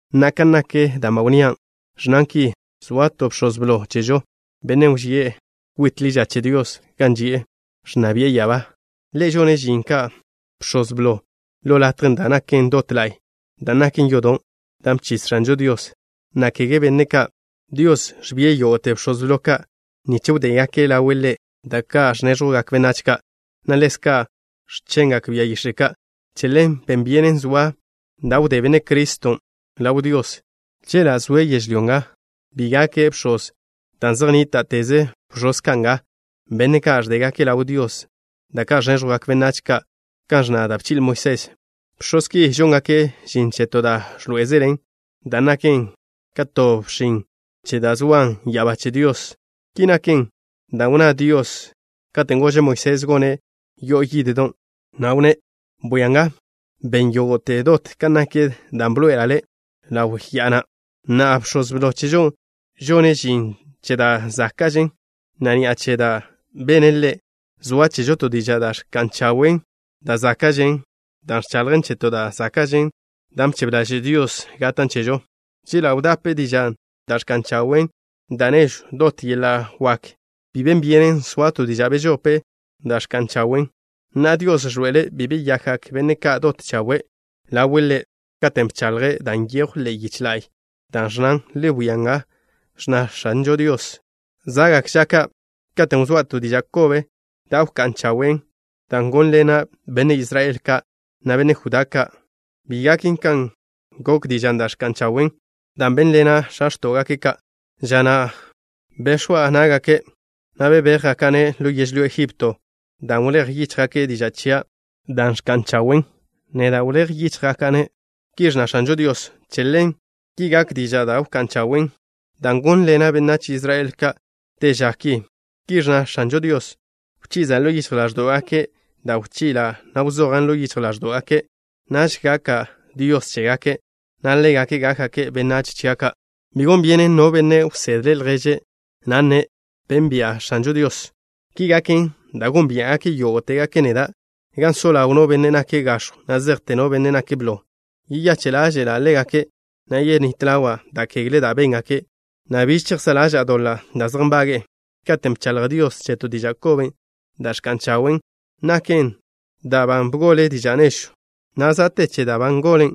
Na'a, kan nak da' ba wnnía', ẕnnan ki: zoa to Bx̱oz Blo ki chežo, Bennen' wži'e kwit ḻi ža che Dios gan ži'e, ẕnna bi'e ya'abá. Ḻe' žone' žin ka Bx̱oz Blo ḻo latjen' dan' naken dot la'y, dan' naken yodon' dan' bchis X̱anžo Dios, na' kege benne' ka'. Dios ẕbie' yógo'te bx̱oz blo ka' nich wdégake' ḻawe' Ḻe' da' ka' ẕnéẕjwgak benách ka', na' ḻezka' x̱chengak bia yix̱e' ka'. Che ḻen ben byenen soa da' wdé Benne' Criston' ḻaw Dios. Chela' zoe' yežlyó nga, bi gake' bx̱oz, dan' zej nníta'teze bx̱oz ka' nga, benne' ka' ẕdégake' ḻaw Dios da' ka' ẕnéẕjwgak benách ka' kan ẕnna da' bchi'le Moisés. Bx̱oz ki žóngake' žin che to da' ẕḻoé'ezelen, dan' naken ka to bxin che dan' zoan ya'abá che Dios. Ki naken dan' wnná Dios katen' gože' Moisés gone' yo'o yiddon', na' wnné': “Bwia nga, ben yógo'te dot kan nak dan' bḻoe'ela' le' ḻaw ya'a na'.” Na'a, Bx̱oz Blo chežo ni, žone' žin che da' záka'žen, na' ni'a che da' bene' Ḻe' zoa chežo to diža' da' ẕka'n chawe' da' záka'žen, dan' ẕchaḻjen che to da' záka'žen, dan' bchebe ḻaže' Dios gatan' chežo. Chela' wdape dižan' da' ẕka'n chawe' da' nežwn' dot yeḻa' wak, bi ben byenen soa to diža' bežope da' ẕka'n chawen'. Na'a, Dios ẕḻoe'ele' bi beyakgak benne' ka' dot chawe' ḻawe' Ḻe' katen' bchaḻje' dan' nyejw ḻe'e yiche la'y, da' ẕnnán: Le wia nga, ẕnna X̱anžo Dios: “Za'gak ža ka' katen' wzóa' to diža' kobe da' wká'n chawen', dan' gónḻena' benne' Israel ka', na' benne' Judá ka'. Bi gaken kan gok dižan' da' ẕka'n chawen', dan' bénḻena' x̱a x̱tó'gake' ka', ža na' bex̱wa' ná'gake', na' bebéjgaka'-ne' ḻo yežlyó Egipto. Dan' wléj yíchjgake' diža' chia' da' ẕka'n chawen', neda' wléj yíchjgaka'-ne'.” Ki ẕnna X̱anžo Dios: “Che ḻen, ki gak diža' da' wká'n chawen' dan' gónḻena' benách Israel ka' te ža ki.” Ki ẕnna X̱anžo Dios: “Wchiza' ḻo yichj ḻáẕdo'gake' da' wchi'la' na' wzojan' ḻo yichj ḻáẕdo'gake'. Naž gaka' Dios chégake' na' ḻégake' gákgake' benách chia' ka'. Bi gon byenen no benne' wsedle' lježe', na' nne': Benbia' X̱anžo Dios. Ki gaken dan' gónbia'gake' yógo'tegake' neda', gan so ḻaw no benne' nake' gax̱jw, na' zejte no benne' nake' blo. Yeyache' ḻáže'la' ḻégake', na' yenít ḻawa' da' kegle da' béngake', na' biž chejsá' ḻaža'a doḻa' da' zej nbage'e.” Katen' bchaḻj Dios che to diža' kobe da' ẕka'n chawen', naken dan' ba bgole diža' nežwn', na' za' te che dan' ba ngolen,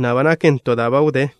na' ba naken da' ba wdén.